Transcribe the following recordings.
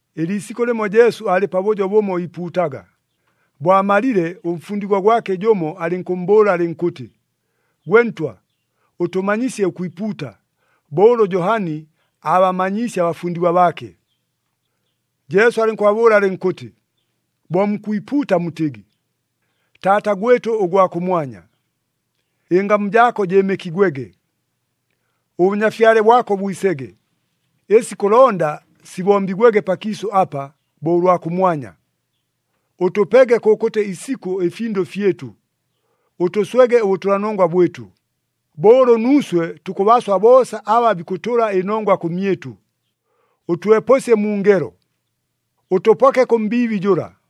Ɨliisikʉ lɨmo Jesu aalɨ pabʉjo bʉmo iipuutaga. Bo amalile, ʉmfundigwa gwake jʉmo alɨnkʉmmbʉʉla alɨnkʉtɨ, “Gwe Ntwa ʉtʉmanyisye ʉkwipuuta, bo ʉlʉ Johani aabamanyiisye abafundigwa baake.” Jesu alɨnkʉbabʉʉla alɨnkʉtɨ, “Bo mukwipuuta mutɨgɨ, ‘Taata [gwɨtʉ ʉgwa kʉmwanya], ɨngamu jaako jɨɨmɨkigwege. ɄBʉnyafyale bwako bwisege. [Ɨsi kʉlonda sibombigwege pakiisʉ apa, bo ʉlwa kʉmwanya.] Ʉtʉpege kʉkʉtɨ isikʉ ɨfindʉ fyɨtʉ. Ʉtʉswege ʉbʉtʉlanongwa bwɨtʉ, bo ʉlʉ nuuswe tukʉbaswa boosa aba bikʉtʉla ɨnongwa kʉmyɨtʉ. Ʉtwepʉsye mu ngelo, [ʉtʉpoke kʉ mbiibi jʉla].’”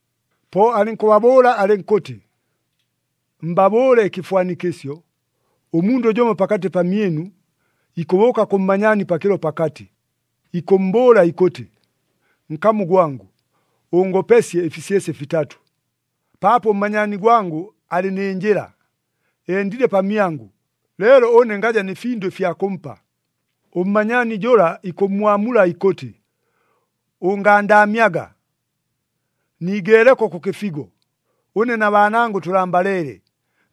Po alɨnkʉbabʉʉla alɨnkʉtɨ, “Mbabʉʉle ɨkɨfwanikɨsyo. Ʉmundʉ jʉmo pakatɨ pamyɨnu, ikʉbʉʉka kʉ mmanyaani pakɨlo pakatɨ, ikʉmmbʉʉla ikʉtɨ, ‘Nkamu gwangʉ, ʉngopesye ɨfisyesye fitatʉ. Paapo ʉmmanyaani gwangʉ alɨ nɨ njɨla, endile pamyangʉ, leelo ʉne ngaja nɨ findʉ ɨfya kʉmpa.’ Ʉmmanyaani jʉla ikʉmmwamula ikʉtɨ, ‘Ʉngandaamyaga! Niigeeleko kʉ kɨfigo! Ʉne na baanangʉ tʉlambaleele.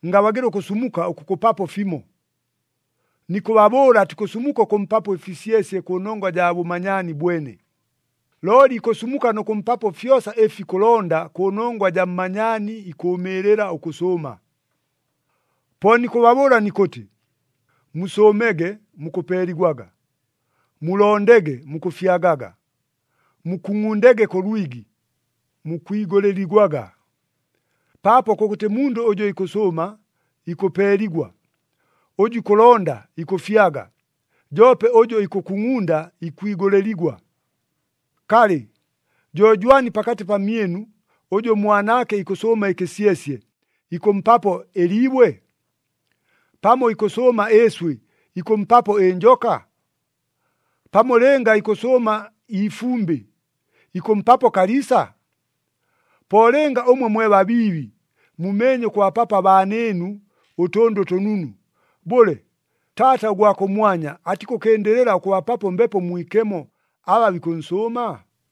Ngabagɨla ʉkʉsumuka ʉkʉkʉpapo fimo!’ Nikʉbabʉʉla, atikʉsumuka ʉkʉmpapo ɨfisyesye kʉnongwa jaa bʉmanyaani bwene, looli ikʉsumuka nʉ kʉmpapo fyosa ɨfi ikʉlonda kʉnongwa jaa mmanyaani ikʉʉmɨɨlɨla ʉkʉsʉʉma. “Po nikʉbabʉʉla nikʉtɨ, musʉʉmege, mukʉpeeligwaga; mulondege, mukʉfyagaga; mukungʼundege kʉ lwigi, mukwigʉlɨligwaga. Paapo kʉkʉtɨ mundʉ ʉjʉ ikʉsʉʉma, ikʉpeeligwa, ʉjʉ ikʉlonda, ikʉfyaga, joope ʉjʉ ikʉkungʼunda, ikwigʉlɨligwa. Kalɨ, jo jwani pakatɨ pamyɨnu, ʉjʉ ʉmwanaake ikʉsʉʉma ɨkɨsyesye, ikʉmpapo ɨliibwe? Pamo ikʉsʉʉma ɨɨswɨ, ikʉmpapo ɨnjoka? Pamo lɨnga ikʉsʉʉma iifumbɨ, ikʉmpapo kaliisa? Po lɨnga ʉmwe mwe babiibi, mumeenye ʉkʉbapapo abaanɨɨnu ʉtʉndʉ ʉtʉnunu, bʉle, Taata ʉgwa kʉmwanya atikʉkɨndɨlɨla ʉkʉbapapo Mbepo Mwikemo aba bikʉnsʉʉma?”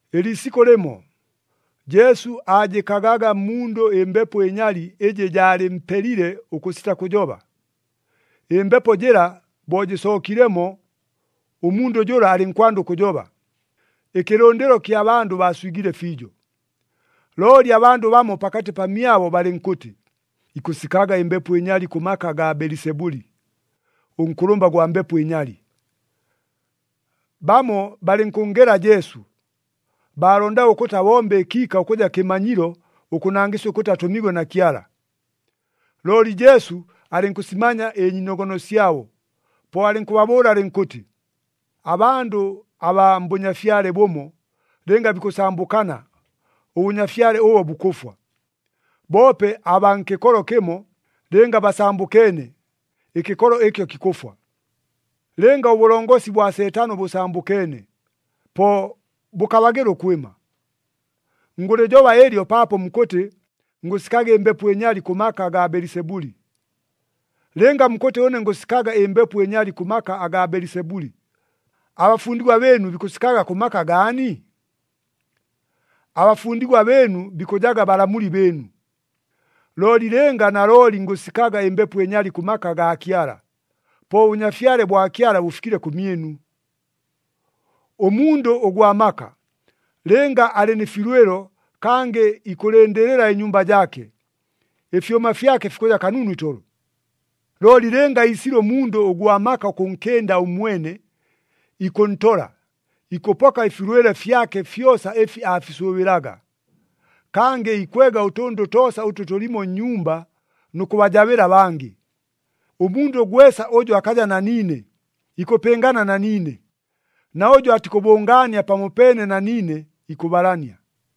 Ɨliisikʉ lɨmo, Jesu aajɨkagaga mmundʉ ɨmbepo ɨnyali ɨjɨ jaalɨmpelile ʉkʉsita kʉjoba. Ɨmbepo jɨla bo jɨsookilemo, ʉmundʉ jʉla alɨnkwanda ʉkʉjoba. Ɨkɨlʉndɨlo kya bandʉ baaswigile fiijo. Looli abandʉ bamo pakatɨ pamyabo balɨnkʉtɨ, “Ikʉsikaga ɨmbepo ɨnyali kʉ maka agaa Belisebuli, ʉnkʉlʉmba gwa mbepo ɨnyali!” Bamo balɨnkʉnngela Jesu, baalondaga ʉkʉtɨ abombe ɨkiika ʉkʉja kɨmanyilo ʉkʉnangɨsya ʉkʉtɨ atʉmiigwe na Kyala. Looli Jesu alɨnkʉsimanya ɨnyiinogono syabo, po alɨnkʉbabʉʉla alɨnkʉtɨ, “Abandʉ abaa mbʉnyafyale bʉmo, lɨnga bikʉsambʉkana, ʉbʉnyafyale ʉbo bukʉfwa. Boope abaa nkɨkolo kɨmo, lɨnga basambʉkeene, ɨkɨkolo ɨkyo kikʉfwa. Lɨnga ʉbʉlongosi bwa Seetano bʉsambʉkeene, po bʉkabagɨla ʉkwɨma. Ngʉlɨjoba ɨlyo paapo mukʉtɨ ngʉsikaga ɨmbepo ɨnyali kʉ maka agaa Belisebuli. Lɨnga mukʉtɨ ʉne ngʉsikaga ɨmbepo ɨnyali kʉ maka agaa Belisebuli, abafundigwa bɨɨnu bikʉsikaga kʉ maka gaani? Abafundigwa bɨɨnu bikʉjaga balamuli bɨɨnu. Looli lɨnga nalooli ngʉsikaga ɨmbepo ɨnyali kʉ maka agaa Kyala, po ʉBʉnyafyale bwa Kyala bʉfikile kʉmyɨnu! “Ʉmundʉ ʉgwa maka, lɨnga alɨ nɨ filwɨlo kangɨ ikʉlɨndɨlɨla ɨnyumba jaake, ɨfyʉma fyake fikʉja kanunu itolo. Looli lɨnga iisile ʉmundʉ ʉgwa maka ʉkʉnkɨnda ʉmwene, ikʉntola, ikʉpoka ɨfilwɨlo fyake fyosa ɨfi aafisʉʉbɨlaga. Kangɨ ikwega ʉtʉndʉ toosa ʉtʉ tʉlimo nnyumba nʉ kʉbajabɨla abangɨ. Ʉmundʉ gwesa ʉjʉ akaja na niine, ikʉpɨngana na niine, na ʉjʉ atikʉbʉngaania pamopeene na niine, ikʉbalania.”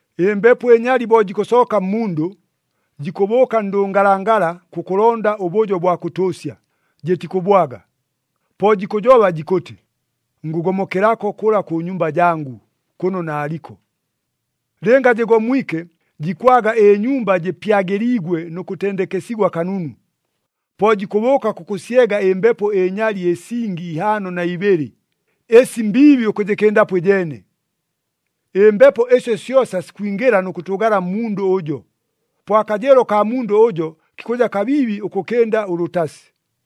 “Ɨmbepo ɨnyali bo jikʉsooka mmundʉ, jikʉbʉʉka ndʉngalangala kʉkʉlonda ʉbʉjo bwa kʉtʉʉsya, jɨtikʉbwaga. Po jikʉjoba jikʉtɨ, ‘Ngʉgomokelako kʉla kʉ nyumba jangʉ, kʉno naaliko.’ Lɨnga jɨgomwike, jikwaga ɨnyumba jɨpyagɨliigwe nʉ kʉtendekesigwa kanunu. Po jikʉbʉʉka kʉkʉsyega ɨmbepo ɨnyali ɨsingi ihaano na ibɨlɨ, ɨsi mbiibi ʉkʉjɨkɨndapo ɨjeene. Ɨmbepo ɨsyo syosa sikwingɨla nʉ kʉtʉʉgala mmundʉ ʉjo. Po akajɨɨlo kaa mundʉ ʉjo kikʉja kabiibi ʉkʉkɨnda ʉlʉtasi.”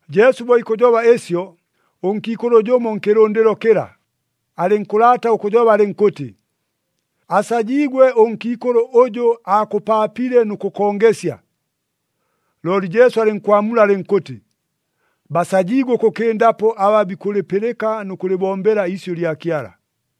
Jesu bo ikʉjoba ɨsyo, ʉnkiikʉlʉ jʉmo nkɨlʉndɨlo kɨla, alɨnkʉlaata ʉkʉjoba alɨnkʉtɨ, “Asajiigwe ʉnkiikʉlʉ ʉjʉ aakʉpaapile nʉ kʉkongesya!” Looli Jesu alɨnkwamula alɨnkʉtɨ, “Basajiigwe ʉkʉkɨndapo aba bikʉlɨpɨlɨka nʉ kʉlɨbombela iisyʉ lya Kyala!”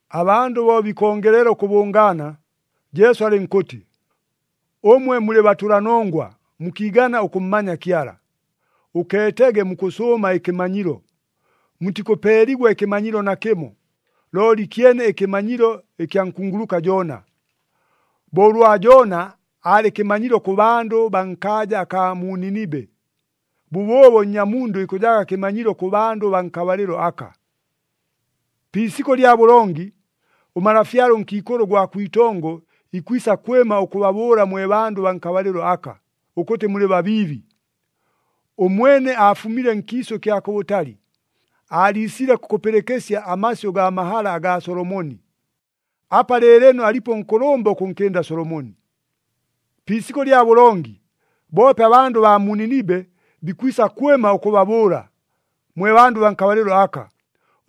Abandʉ bo bikongelela ʉkʉbʉngaana, Jesu alɨnkʉtɨ, “Ʉmwe mulɨ batʉlanongwa mukiigana ʉkʉmmanya Kyala! Ʉkeetege mukʉsʉʉma ɨkɨmanyilo! Mutikʉpeeligwa ɨkɨmanyilo nakɨmo, looli kyene ɨkɨmanyilo ɨkya nkunguluka Joona.” Bo ʉlwa Joona aalɨ kɨmanyilo kʉ bandʉ baa nkaaja akaa mu Ninibe, bʉbʉʉbo Nnyamundʉ ikʉjaga kɨmanyilo kʉ bandʉ baa nkabalɨlo aka. “Pi isikʉ lya bʉlongi, ʉmalafyale ʉnkiikʉlʉ ʉgwa kwitongo ikwisa kwɨma ʉkʉbabʉʉla mwe bandʉ baa nkabalɨlo aka, ʉkʉtɨ mulɨ babiibi. Ʉmwene aafumile nkiisʉ kya kʉbʉtali, aaliisile kʉkʉpɨlɨkɨsya amasyʉ gaa mahala agaa Solomoni. Apa lɨɨlɨno alipo ʉnkʉlʉmba ʉkʉnkɨnda Solomoni! Pi isikʉ lya bʉlongi, boope abandʉ abaa mu Ninibe bikwisa kwɨma ʉkʉbabʉʉla, mwe bandʉ baa nkabalɨlo aka,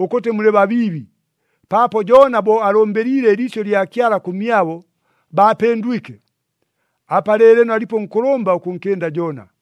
ʉkʉtɨ mulɨ babiibi, paapo Joona bo alʉmbɨliile ɨliisyʉ lya Kyala kʉmyabo, baapɨndwike. Apa lɨɨlɨno alipo ʉnkʉlʉmba ʉkʉnkɨnda Joona!”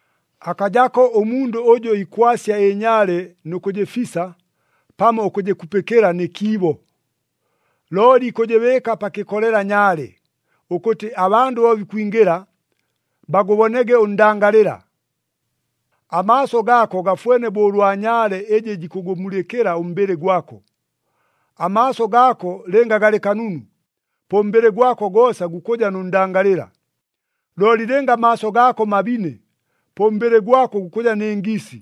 “Akajako ʉmundʉ ʉjʉ ikwasya ɨnyaale nʉ kʉjɨfisa pamo ʉkʉjɨkupɨkɨla nɨ kiibo. Looli ikʉjɨbɨɨka pa kɨkolela nyaale, ʉkʉtɨ abandʉ bo bikwingɨla, bagʉbonege ʉndangalɨla. Amaaso gaako gafwene bo ʉlwa nyaale ɨjɨ jikʉgʉmulɨkɨla ʉmbɨlɨ gwako. Amaaso gaako lɨnga galɨ kanunu, po ʉmbɨlɨ gwako goosa gukʉja nʉ ndangalɨla. Looli lɨnga amaaso gaako mabine, po ʉmbɨlɨ gwako gukʉja nɨ ngiisi.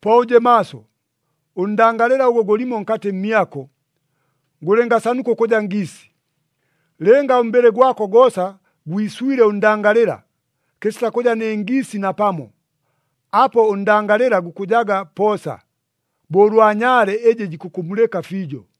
Po ʉje maaso, ʉndangalɨla ʉgʉ gʉlimo nkatɨ mmyako, gʉlɨngasanuka ʉkʉja ngiisi! Lɨnga ʉmbɨlɨ gwako goosa gwiswile ʉndangalɨla, kɨsita kʉja nɨ ngiisi napamo, apo ʉndangalɨla gukʉjaga poosa, bo ʉlwa nyaale ɨjɨ jikʉkʉmulɨka fiijo.”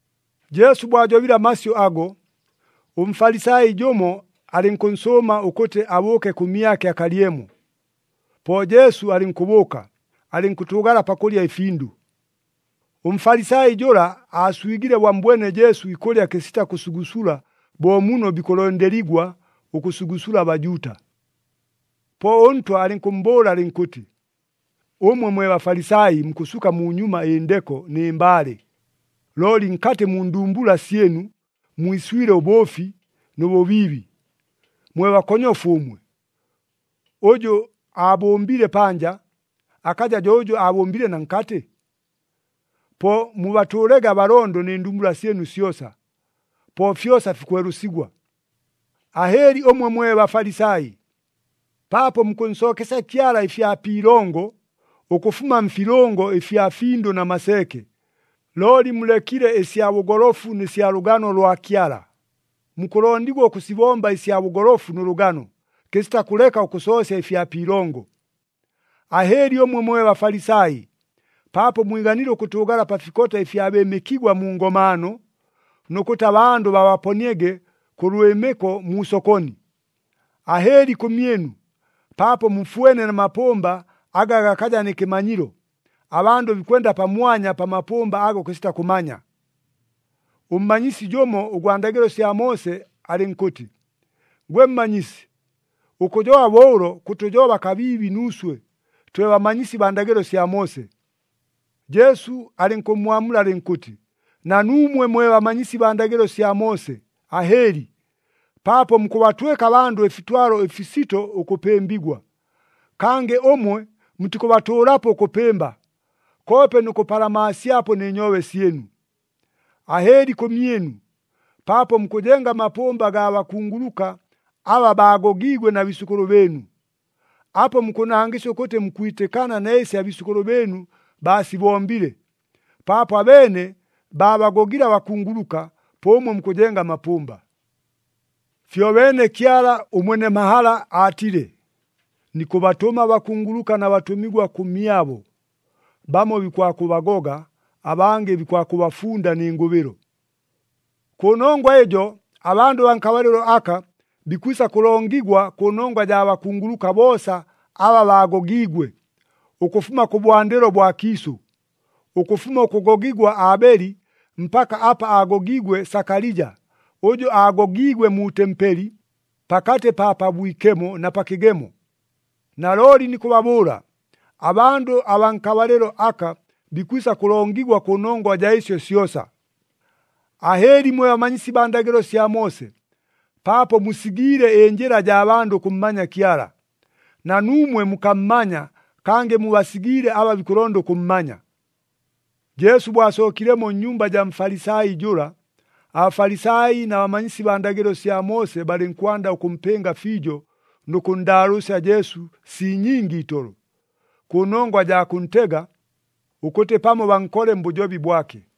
Jesu bo ajobile amasyʉ ago, ʉMfalisai jʉmo alɨnkʉnsʉʉma ʉkʉtɨ abʉʉke kʉmyake akalyemo. Po Jesu alɨnkʉbʉʉka, alɨnkʉtʉʉgala pakʉlya ɨfindʉ. ɄMfalisai jʉla aaswigile bo ammbwene Jesu ikʉlya kɨsita kʉsugusula bo muno bikʉlondeligwa ʉkʉsugusula aBajuuta. Po ʉNtwa alɨnkʉmmbʉʉla alɨnkʉtɨ, “Ʉmwe mwe Bafalisai, mukʉsuka munyuma ɨndeko nɨ mbaale, looli nkatɨ mu ndumbula syɨnu, mwiswile ʉbʉʉfi nʉ bʉbiibi. Mwe bakonyofu ʉmwe! Ʉjʉ aabʉmbile panja, akaja jo ʉjʉ aabʉmbile na nkatɨ? Po mubatʉʉlege abalondo nɨ ndumbula syɨnu syosa, po fyosa fikwelʉsigwa. “Ahɨɨli ʉmwe mwe Bafalisai! Paapo mukʉnsookesya Kyala ɨfya pi ilongo, ʉkʉfuma mfilʉngo ɨfya findʉ na maseeke. Looli mulekile ɨsya bʉgolofu nɨ sya lʉgano lwa Kyala. Mukʉlondigwa ʉkʉsibomba ɨsya bʉgolofu nʉ lʉgano, kɨsita kʉleka ʉkʉsoosya ɨfya pi ilongo. Ahɨɨli ʉmwe mwe Bafalisai! Paapo mwiganile ʉkʉtʉʉgala pa fikota ɨfya bɨɨmɨkigwa mu ngomaano, nʉ kʉtɨ abandʉ babaponiege kʉ lwɨmɨko mu sokoni. Ahɨɨli kʉmyɨnu! Paapo mufwene na mapʉmba aga gakaja nɨ kɨmanyilo, abandʉ bikwenda pamwanya pa mapʉmba ago kɨsita kʉmanya.” Ʉmmanyisi jʉmo ʉgwa ndagɨlo sya Moose alɨnkʉtɨ, “Gwe Mmanyisi, ʉkʉjoba bo ʉlo, kʉtʉjoba kabiibi nuuswe, twe bamanyisi baa ndagɨlo sya Moose.” Jesu alɨnkʉmmwamula alɨnkʉtɨ, “Na nuumwe mwe bamanyisi baa ndagɨlo sya Moose, ahɨɨli! Paapo mukʉbatwɨka abandʉ ɨfitwalo ɨfisito ʉkʉpɨmbigwa. Kangɨ ʉmwe mutikʉbatʉʉlapo ʉkʉpɨmba, koope nʉ kʉpalamaasyapo nɨ nyoobe syɨnu! “Ahɨɨli kʉmyɨnu! Paapo mukʉjenga amapʉmba gaa bakunguluka, aba baagogiigwe na biisʉkʉlʉ bɨɨnu! Apo mukʉnangɨsya ʉkʉtɨ mukwitɨkana na ɨsi abiisʉkʉlʉ bɨɨnu baasibombile. Paapo abeene baabagogile abakunguluka, po ʉmwe mukʉjenga amapʉmba! “Fyobeene Kyala ʉmwene mahala aatile, ‘Nikʉbatʉma abakunguluka na batʉmigwa kʉmyabo, bamo bikwakʉbagoga, abangɨ bikwakʉbafunda nɨ ngʉbɨlo.’ Kʉnongwa ɨjo abandʉ baa nkabalɨlo aka bikwisa kʉlongigwa kʉnongwa jaa bakunguluka boosa aba baagogiigwe, ʉkʉfuma kʉbwandɨlo bwa kiisʉ, ʉkʉfuma ʉkʉgogigwa Aabeli, mpaka apa aagogiigwe Sakalija, ʉjʉ aagogiigwe mu tempeli pakatɨ pa Pabwikemo na pa kɨgemo. Nalooli nikʉbabʉʉla, abandʉ abaa nkabalɨlo aka bikwisa kʉlongigwa kʉnongwa jaa ɨsyo syosa. “Ahɨɨli mwe bamanyisi baa ndagɨlo sya Moose! Paapo musigiile ɨnjɨla jaa bandʉ ʉkʉmmanya Kyala. Na nuumwe mukammanya, kangɨ mubasigiile aba bikʉlonda ʉkʉmmanya.” Jesu bo asookilemo nnyumba jaa Mfalisai jʉla, aBafalisai na bamanyisi baa ndagɨlo sya Moose balɨnkwanda ʉkʉmpɨnga fiijo nʉ kʉnndaalʉʉsya Jesu sii nyingi itolo, kʉnongwa jaa kʉntega, ʉkʉtɨ pamo bankole mbʉjobi bwake.